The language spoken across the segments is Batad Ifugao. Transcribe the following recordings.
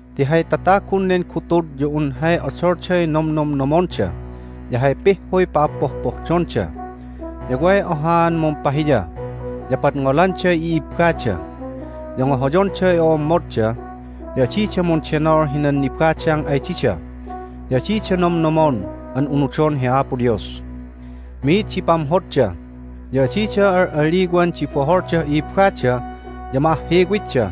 ti hay tatagun nen gutud ya un hay odolday nomnomnomonda ya hay pihhuy pa'appohpohdonda. Ya way ohaan mumpahiya, ya padngolanday i'ibbada, ya ngohoyonday o'ommodda, ya adida mundenol hinan nibadang ay dida, ya adida nomnomon an unudon hi Apo Dios. Mi'id di pamhodda, ya adida al'aliwan di boholdah i'ibbada, ya ma'ahhiwitda,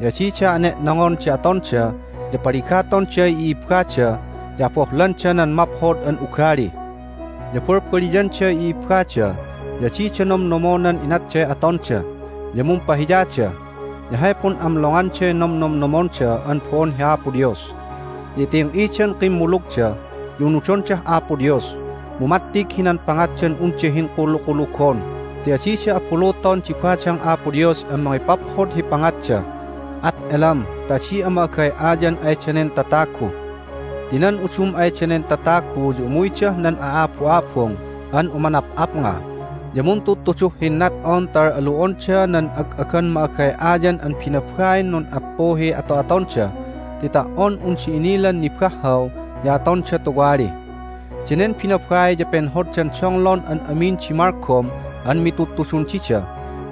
ya adida ane'nongon di atonda, ya paligatonday i'ibbada, ya abohlanda nan maphod an ugali. Ya balbaliyanday i'ibbada, ya adida nomnomonan inatday atonda, ya mumpahiyada, ya hay pun'amlonganday nomnomnomonda an bo'on hi Apo Dios. Ya iting'idan kimmulugda, ya unudondah Apo Dios, mu mattig hinan pangatdan unda hinkulukulugon ti adida abuluton di badang Apo Dios an mangipaphod hi pangatda. At elam ta adi'a ma'agay'ayan ay danen tatagu. Ti nan udum ay danen tatagu ya umuydah nan a'abu'abung an umanap'apnga, ya muntudtuduh hinnat'on ta al'alu'onda nan ag'agan ma'agay'ayan an binabain nun'appuhiy ato'atonda ti ta"on unda inilan nibahhaw ya atonda tuwali. Danen binabai ya penhoddan donglon an amin di malgom an mitudtudun dida,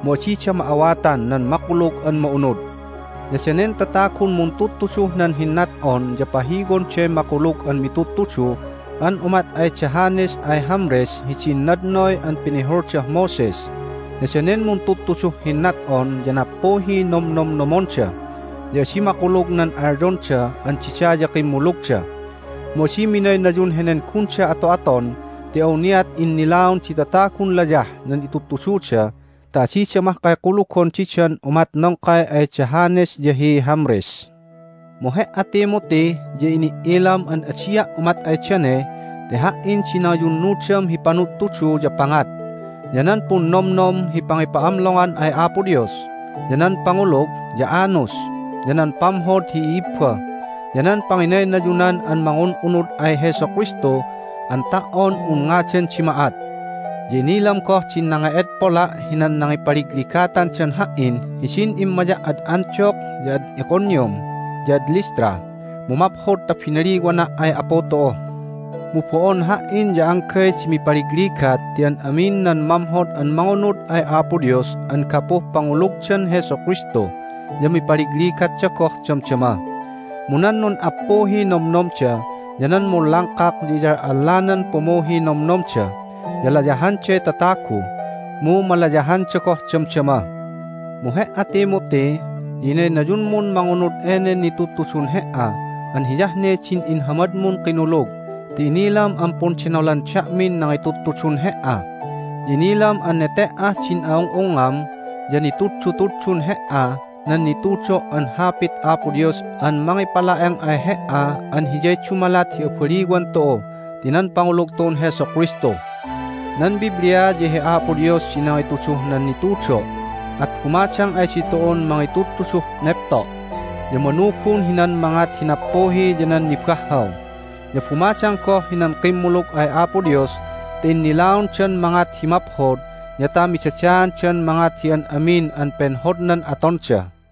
mu adida ma'awatan nan Makulug an Ma'unud. Ya danen tatagun muntudtuduh nan hinnat'on ya pahiwonday makulug an mitudtudu an umat ay da Jannes ay Jambres hidin nadnoy an pinihuldah Moses. Ya danen muntudtuduh hinnat'on ya nappuhiy nomnomnomonda, ya adi makulug nan alyonda an dida ya kimmulugda. Mu adi minaynayun henen gunda ato'aton ti awniat innilaon di tatagun layah nan itudtududa ta adida mahkay kulugon didan umat nongkay ay da Jannes ya hi Jambres. Mu he"a, Timothy, ya ini"ilam an adia' umat ay dane ti ha"in di nangiyunnudam hi panudtudu ya pangat, ya nan punnomnom hi pangipa'amlongan ay Apo Dios, ya nan pangulug, ya anus, ya nan pamhod hi i'ibba, ya nan panginaynayunan an mangun'unud ay Jesu Kristu an ta"on un ngadan di ma'at. Ya inilam goh din nange'edpola' hinan nangipaligligatandan ha"in hidin immaya' ad Antioch, ya ad Iconium, ya ad Lystra, mu maphod ta binaliwana' ay Apu tu'u. Mu bo'on ha"in ya anggay di mipaligligat ti an amin nan mamhod an mangunud ay Apo Dios an gapuh pangulugdan Jesu Kristu ya mipaligligatda goh damdama. Mu nan nun'appuhiy nomnomda ya nan munlangkak ya iyal'allanan pumuhiy nomnomda, ya layahanday tatagu, mu malayahanda goh damdama. Mu he"a, Timothy, ya inaynayunmun mangunud enen nitudtudun he"a an hiyah ne din inhamadmun kinulug ti inilam an pundenolan da'min nangitudtudun he"a. Ya inilam an nete"ah din a'ung'ungngam ya nituddutuddun he"a nan nitudo' an Hapit Apo Dios an mangipala'eng ay he"a an hiyay dumalat hi abaliwan tu'u ti nan pangulug tu'un Jesu Kristu. Nan Biblia ya hi Apo Dios di nangituduh nan nitudo'. At bumadang ay ditu'un mangitudtuduh nepto', ya manugun hinan mangat hi nappuhi ya nan nibahhaw. Ya bumadang goh hinan kimmulug ay Apo Dios ta innilaondan mangat hi maphod ya ta midadaandan mangat hi an amin an penhodnan atonda.